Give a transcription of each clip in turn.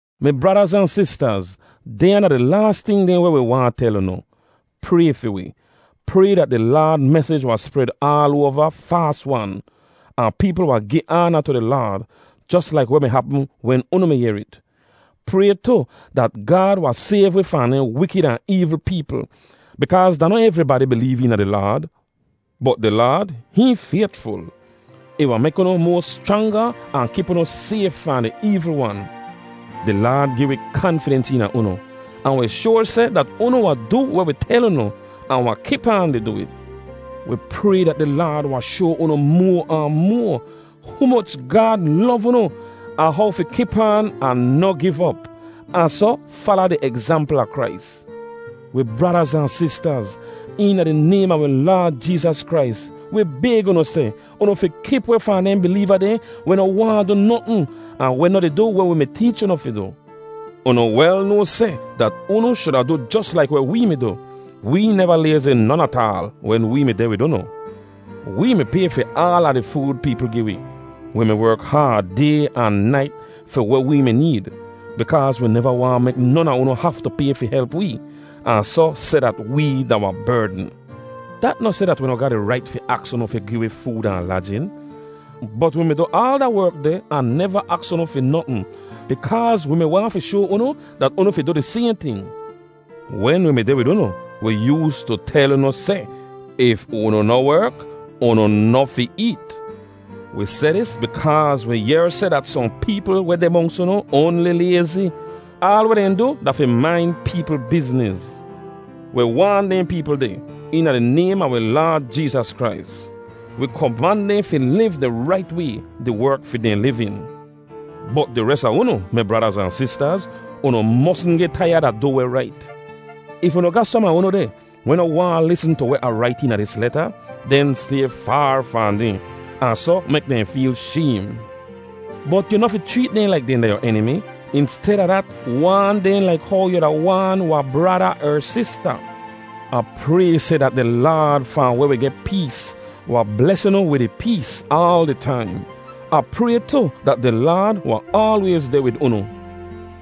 Mi bradaz ahn sistaz, dehnya da di laas ting dehn weh wi waahn tel unu. Pray fi wi. Pray dat di Laad mesij wahn spred aal oava faas-wan, ahn peepl wahn gi aana tu di Laad, jos laik weh mi hapm wen unu mi yehr it. Pray tu dat Gaad wahn sayv wi fahn dehn wikid ahn eevl peepl, bikaaz da noh evribadi bileev eena di Laad. Bot di Laad, hihn faytful. Ih wahn mek unu moa schranga ahn kip unu sayf fahn di eevl wan. Di Laad gi wi kanfidens eena unu, ahn wi shoar seh dat unu wahn du weh wi tel unu, ahn wahn kip aan di du it. Wi pray dat di Laad wahn shoa unu moa ahn moa humoch Gaad lov unu ahn how fi kip aan ahn noh giv op, ahn soh fala di egzampl a Krais. Wi bradaz ahn sistaz, eena di naym a wi Laad Jeezas Krais, wi bayg unu seh, unu fi kip weh fahn dehn bileeva dehn weh noh waahn du notn ahn weh noh di du weh wi mi teech unu fi du. Unu wel noa seh dat unu shuda du jos laik weh wee mi du. Wee neva layzi non ataal wen wee mi deh wid unu. Wee mi pay fi aala di food peepl gi wi. Wi mi werk haad, day ahn nait, fi weh wee mi need, bikaaz wi neva waahn mek non a unu haftu pay fi help wee, ahn soh seh dat wee da wahn berdn. Dat noh seh dat wi noh ga di rait fi aks unu fi gi wi food ahn lajin. Bot wi mi du aal da werk deh ahn neva aks unu fi notn, bikaaz wi mi waahn fi shoa unu dat unu fi du di sayhn ting. Wen wi mi deh wid unu, wi yoostu tel unu seh, “If unu noh werk, unu noh fi eet.” Wi seh dis bikaaz wi yehr seh dat sohn peepl weh deh monks unu oanli layzi. Aal weh dehn du da fi main peepl bizniz. Wi waan dehn peepl deh, eena di naym a wi Laad Jeezas Krais. Wi koman dehn fi liv di rait way, di werk fi dehn livin. Bot di res a unu, mi bradaz ahn sistaz, unu mosn geh taiyad a du weh rait. If unu ga som a unu deh, weh noh waahn lisn tu weh Ah rait eena dis leta, den stay faar fahn dehn, ahn soh mek dehn feel shaym. Bot yu noh fi chreet dehn laik dehn da yu enimi; insteda dat, waan dehn laik how yu wuda waan wahn brada er sista. Ah pray seh dat di Laad fahn weh wi geh pees wahn bles unu wid ih pees aal di taim. Ah pray tu dat di Laad wahn aalwayz deh wid unu.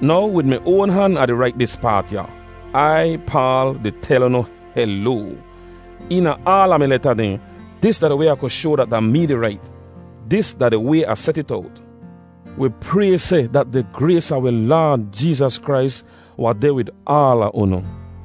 Now wid mi oan han Ah di rait dis paat ya: Ai, Paal, di tel unu heloa. Eena aala mi leta dehn, dis da di way Ah ku shoa dat da mee di rait. Dis da di way Ah set it owt. Wi pray seh dat di grays a wi Laad Jeezas Krais wahn deh wid aala unu.